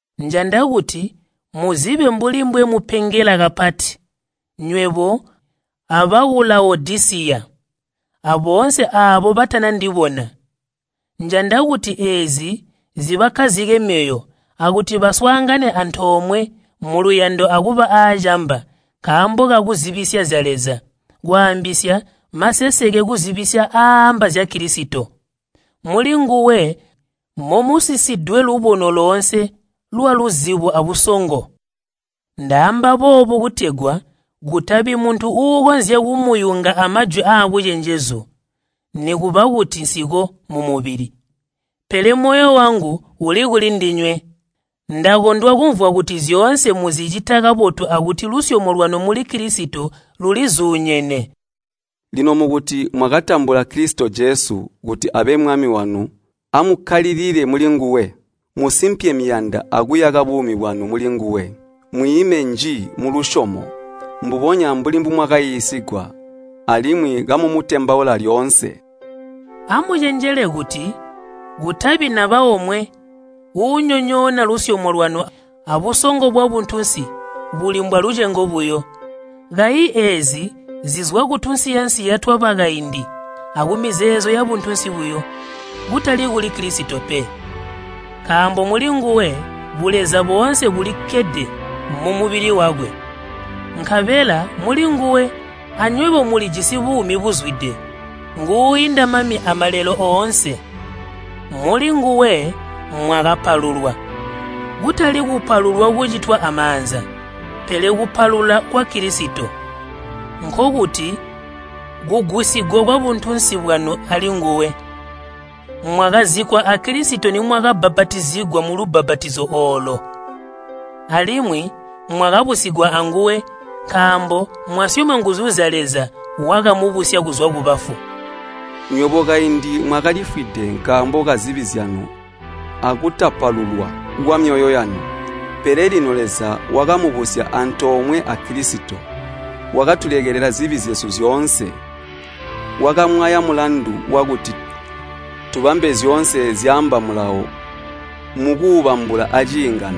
Njanda kuti muzibe mbuli mbwemupengela kapati, nywebo abaku Lawodisiya, aboonse aabo batana ndibona. Njanda kuti eezi zibakkazike myoyo akuti baswaangane antoomwe muluyando akuba aacamba nkaambo kakuzibisya zya Leza, kwaambisya, maseseke kuzibisya aaamba zya Kilisito. Mulinguwe momusisidwe lubono loonse lwaluzibo abusongo. Ndaamba boobu kutegwa kutabi muntu uukonzya kumuyunga amajwi aabucenjezu. Nikuba kuti nsiko mumubili, pele moyo wangu uli kuli ndinywe. Ndakondwa kumvwa kuti zyoonse muzicita kabotu akuti lusyomo lwanu muli Kilisito lulizuunyene. Lino mukuti mwakatambula Kilisito Jesu kuti abe Mwami wanu amukkalilile mulinguwe. Musimpye miyanda akuyaka buumi bwanu mulinguwe. Mwiime nji mulusyomo, mbubonya mbuli mbumwakaiisigwa, alimwi kamumutembaula lyoonse. Amucenjele kuti kutabi naba omwe uunyonyoona lusyomo lwanu abusongo bwabuntunsi buli mbwalucengo buyo. Kayi eezi zizwa kutunsiya-nsiya twabakaindi akumizeezo yabuntunsi buyo, kutali kuli Kilisito pe. Nkaambo mulinguwe buleza boonse bulikkede mumubili wakwe. Nkabela mulinguwe anywebo mulijisi buumi buzwide. Nguuinda mami amalelo oonse. Mulinguwe mwakapalulwa, kutali kupalulwa kucitwa amaanza, pele kupalula kwa Kilisito, nkokuti kugwisigwa kwabuntunsi bwanu alinguwe. Mwakazikkwa a Kilisito nimwakabbapatizigwa mulubbapatizo oolo, alimwi mwakabusigwa anguwe nkaambo mwasyoma nguzu zya Leza wakamubusya kuzwa kubafu. Nywebo kaindi mwakalifwide nkaambo kazibi zyanu akutapalulwa kwamyoyo yanu. Pele lino Leza wakamubusya antoomwe a Kilisito, wakatulekelela zibi zyesu zyoonse. Wakamwaya mulandu wakuti tubambe zyoonse zyaamba Mulawo mukuubambula aciingano.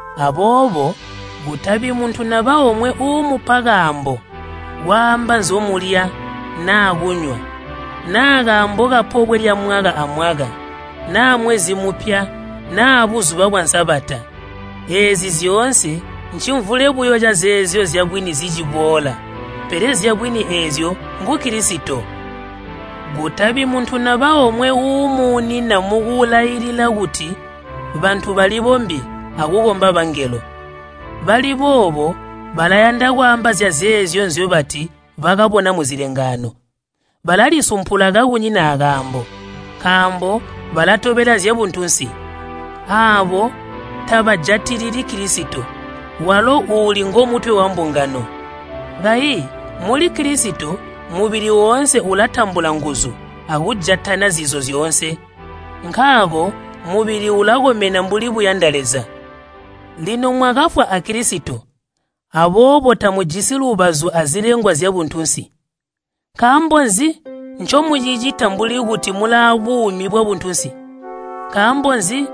Aboobo kutabi muntu naba omwe uumupa kaambo kwaamba nzyomulya naa kunywa naa kaambo kapobwe lyamwaka amwaka, naa mwezi mupya naa buzuba bwa Sabata. Eezi zyoonse ncimvule buyo cazeezyo zyabwini ziciboola, pele zyabwini eezyo ngu Kilisito. Kutabi muntu naba omwe uumuunina mukulailila kuti bantu balibombye akukomba bangelo. Bali boobo balayanda kwaamba zyazeezyo nzyobati bakabona muzilengaano. Balalisumpula kakunyina akaambo, nkaambo balatobela zyabuntunsi. Aabo tabajatilili Kilisito walo uuli ngomutwe wambungano. Kayi muli Kilisito mubili woonse ulatambula nguzu akujatana zizo zyoonse. Nkaako mubili ulakomena mbuli buyanda Leza. Lino mwakafwa a Kilisito aboobo tamujisi lubazu azilengwa zyabuntunsi. Nkaambo nzi ncomucicita mbuli kuti mulaabuumi bwabuntunsi? Nkaambo nzi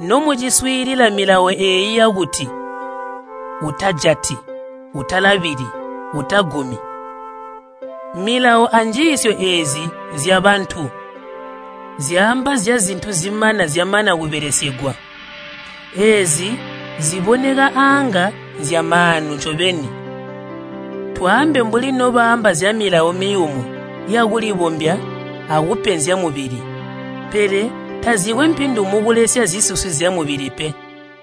nomuciswiilila milawo eeyi yakuti, “Utajati,” “Utalabili,” “Utagumi?” Milawo anjiisyo eezi nzyabantu, zyaamba zyazintu zimana zyamana kubelesegwa. Eezi ziboneka aanga nzyamaanu ncobeni, twaambe mbuli nobaamba zya milawo miyumu ya kulibombya akupenzya mubili. Pele tazikwe mpindu mukulesya zisusi zyamubili pe.